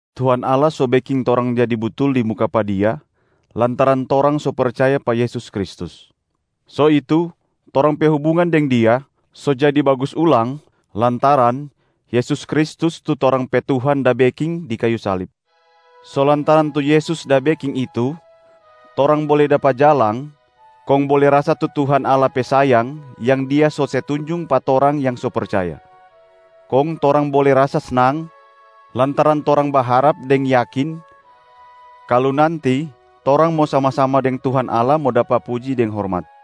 Tuhan Allah so beking torang jadi butul di muka pa Dia lantaran torang so percaya pa Yesus Kristus. So itu, torang pe hubungan deng Dia so jadi bagus ulang lantaran Yesus Kristus tu torang pe Tuhan da beking di kayu salib. So lantaran tu Yesus da beking itu, torang bole dapa jalang kong bole rasa tu Tuhan Allah pe sayang yang Dia so se tunjung pa torang yang so percaya. Kong torang bole rasa snang lantaran torang baharap deng yakin kalu nanti torang mo sama-sama deng Tuhan Allah mo dapa puji deng hormat.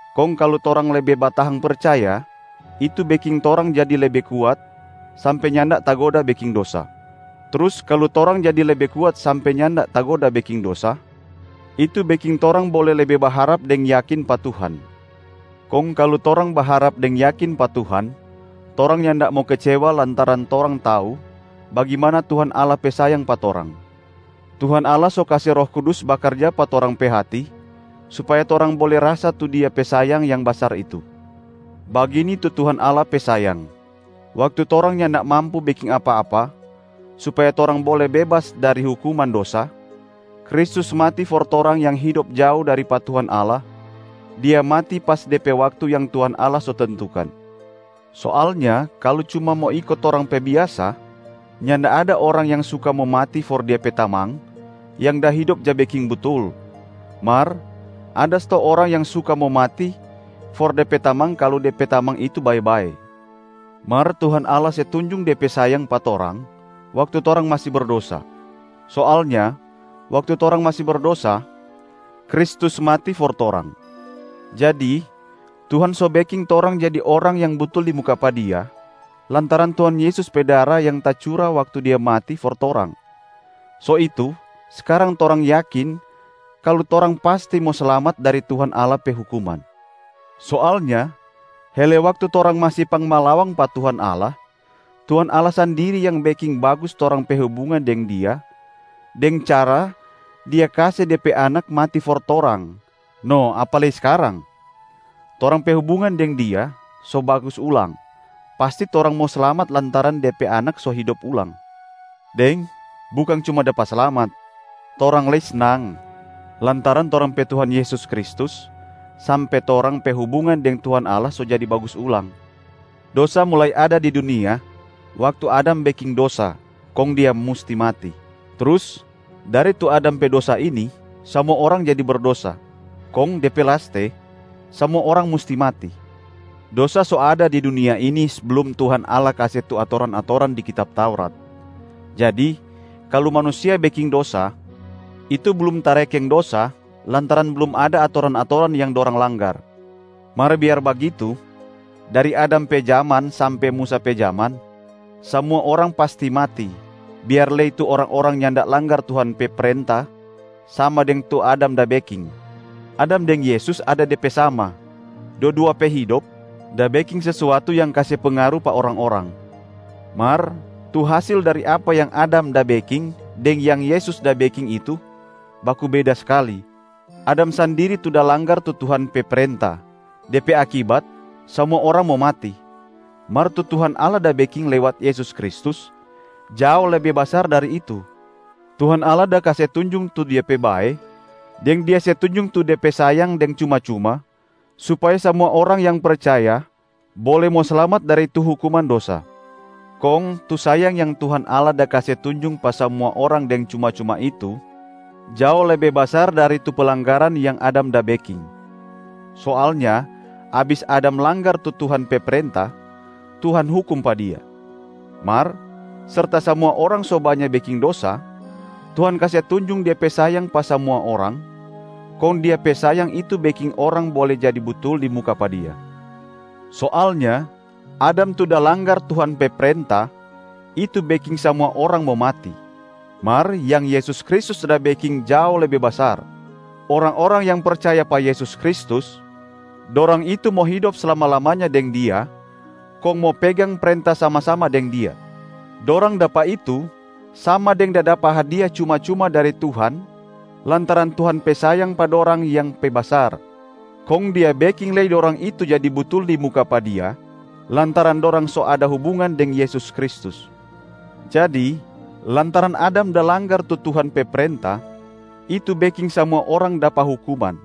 Kong kalu torang lebe batahang percaya, itu beking torang jadi lebe kuat sampe nyanda tagoda beking dosa. Trus kalu torang jadi lebe kuat sampe nyanda tagoda beking dosa, itu beking torang bole lebe baharap deng yakin pa Tuhan. Kong kalu torang baharap deng yakin pa Tuhan, torang nyanda mo kecewa lantaran torang tau bagimana Tuhan Allah pe sayang pa torang. Tuhan Allah so kase Roh Kudus bakarja pa torang pe hati supaya torang bole rasa tu Dia pe sayang yang basar itu. Bagini tu Tuhan Allah pe sayang: waktu torang nyanda mampu beking apa-apa supaya torang bole bebas dari hukuman dosa, Kristus mati for torang yang hidop jao dari pa Tuhan Allah, Dia mati pas de pe waktu yang Tuhan Allah so tentukan. Soalnya kalu cuma mo iko torang pe biasa, nyanda ada orang yang suka mo mati for dia pe tamang yang da hidop ja beking butul, mar ada stou orang yang suka mo mati for de pe tamang kalu de pe tamang itu bae-bae. Mar Tuhan Allah se tunjung De pe sayang pa torang waktu torang masi berdosa. Soalnya waktu torang masi berdosa, Kristus mati for torang. Jadi Tuhan so beking torang jadi orang yang butul di muka pa Dia lantaran Tuhan Yesus pe dara yang tacura waktu Dia mati for torang. So itu skarang torang yakin kalu torang pasti mo slamat dari Tuhan Allah pe hukuman. Soalnya hele waktu torang masi pangmalawang pa Tuhan Allah, Tuhan Allah sandiri yang beking bagus torang pe hubungan deng Dia deng cara Dia kase De pe Anak mati for torang, no apa lei skarang. Torang pe hubungan deng Dia so bagus ulang, pasti torang mo slamat lantaran De pe Anak so hidop ulang. Deng bukang cuma dapa slamat, torang lei snang lantaran torang pe Tuhan Yesus Kristus sampe torang pe hubungan deng Tuhan Allah so jadi bagus ulang. Dosa mulai ada di dunia waktu Adam beking dosa, kong dia musti mati. Trus dari tu Adam pe dosa ini, samua orang jadi berdosa. Kong de pe laste, samua orang musti mati. Dosa so ada di dunia ini seblum Tuhan Allah kase tu atoran-atoran di kitab Taurat. Jadi kalu manusia beking dosa, itu blum tarekeng dosa lantaran blum ada atoran-atoran yang dorang langgar. Mar biar bagitu, dari Adam pe jaman sampe Musa pe jaman, samua orang pasti mati, biar lei tu orang-orang nyanda langgar Tuhan pe prenta sama deng tu Adam da beking. Adam deng Yesus ada de pe sama, dua-dua pe hidop da beking sesuatu yang kase pengaru pa orang-orang. Mar tu hasil dari apa yang Adam da beking deng yang Yesus da beking itu baku beda skali. Adam sandiri tu da langgar tu Tuhan pe prenta, de pe akibat samua orang mo mati. Mar tu Tuhan Allah da beking lewat Yesus Kristus jao lebe basar dari itu, Tuhan Allah da kase tunjung tu Dia pe bae deng Dia se tunjung tu De pe sayang deng cuma-cuma supaya samua orang yang percaya bole mo slamat dari tu hukuman dosa. Kong tu sayang yang Tuhan Allah da kase tunjung pa samua orang deng cuma-cuma itu jao lebe basar dari tu pelanggaran yang Adam da beking. Soalnya abis Adam langgar tu Tuhan pe prenta, Tuhan hukum pa dia. Mar serta samua orang so banya beking dosa, Tuhan kase tunjung Dia pe sayang pa samua orang, kong Dia pe sayang itu beking orang bole jadi butul di muka pa Dia. Soalnya Adam tu da langgar Tuhan pe prenta, itu beking samua orang mo mati. Mar yang Yesus Kristus da beking jao lebe basar. Orang-orang yang percaya pa Yesus Kristus, dorang itu mo hidop slama-lamanya deng Dia kong mo pegang prenta sama-sama deng Dia. Dorang dapa itu sama deng da dapa hadia cuma-cuma dari Tuhan lantaran Tuhan pe sayang pa dorang yang pe basar, kong Dia beking lei dorang itu jadi butul di muka pa Dia lantaran dorang so ada hubungan deng Yesus Kristus. Jadi lantaran Adam da langgar tu Tuhan pe prenta, itu beking samua orang dapa hukuman.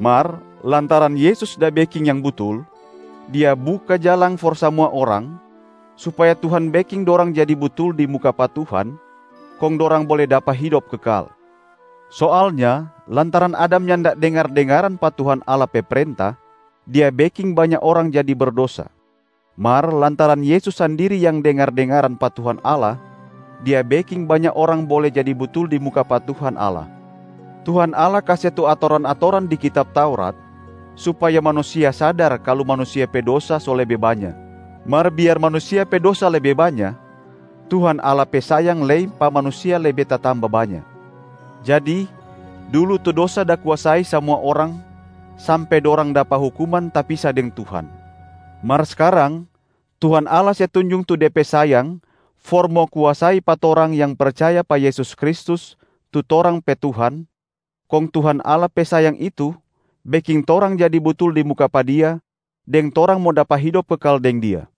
Mar lantaran Yesus da beking yang butul, Dia buka jalang for samua orang supaya Tuhan beking dorang jadi butul di muka pa Tuhan kong dorang bole dapa hidop kekal. Soalnya lantaran Adam nyanda dengar-dengaran pa Tuhan Allah pe prenta, dia beking banya orang jadi berdosa. Mar lantaran Yesus sandiri yang dengar-dengaran pa Tuhan Allah, Dia beking banya orang bole jadi butul di muka pa Tuhan Allah. Tuhan Allah kase tu atoran-atoran di kitab Taurat supaya manusia sadar kalu manusia pe dosa so lebe banya. Mar biar manusia pe dosa lebe banya, Tuhan Allah pe sayang lei pa manusia lebe tatamba banya. Jadi, dulu tu dosa da kuasai samua orang sampe dorang dapa hukuman tapisa deng Tuhan. Mar skarang Tuhan Allah se tunjung tu De pe sayang for mo kuasai pa torang yang percaya pa Yesus Kristus tu torang pe Tuhan, kong Tuhan Allah pe sayang itu beking torang jadi butul di muka pa Dia deng torang mo dapa hidop kekal deng Dia.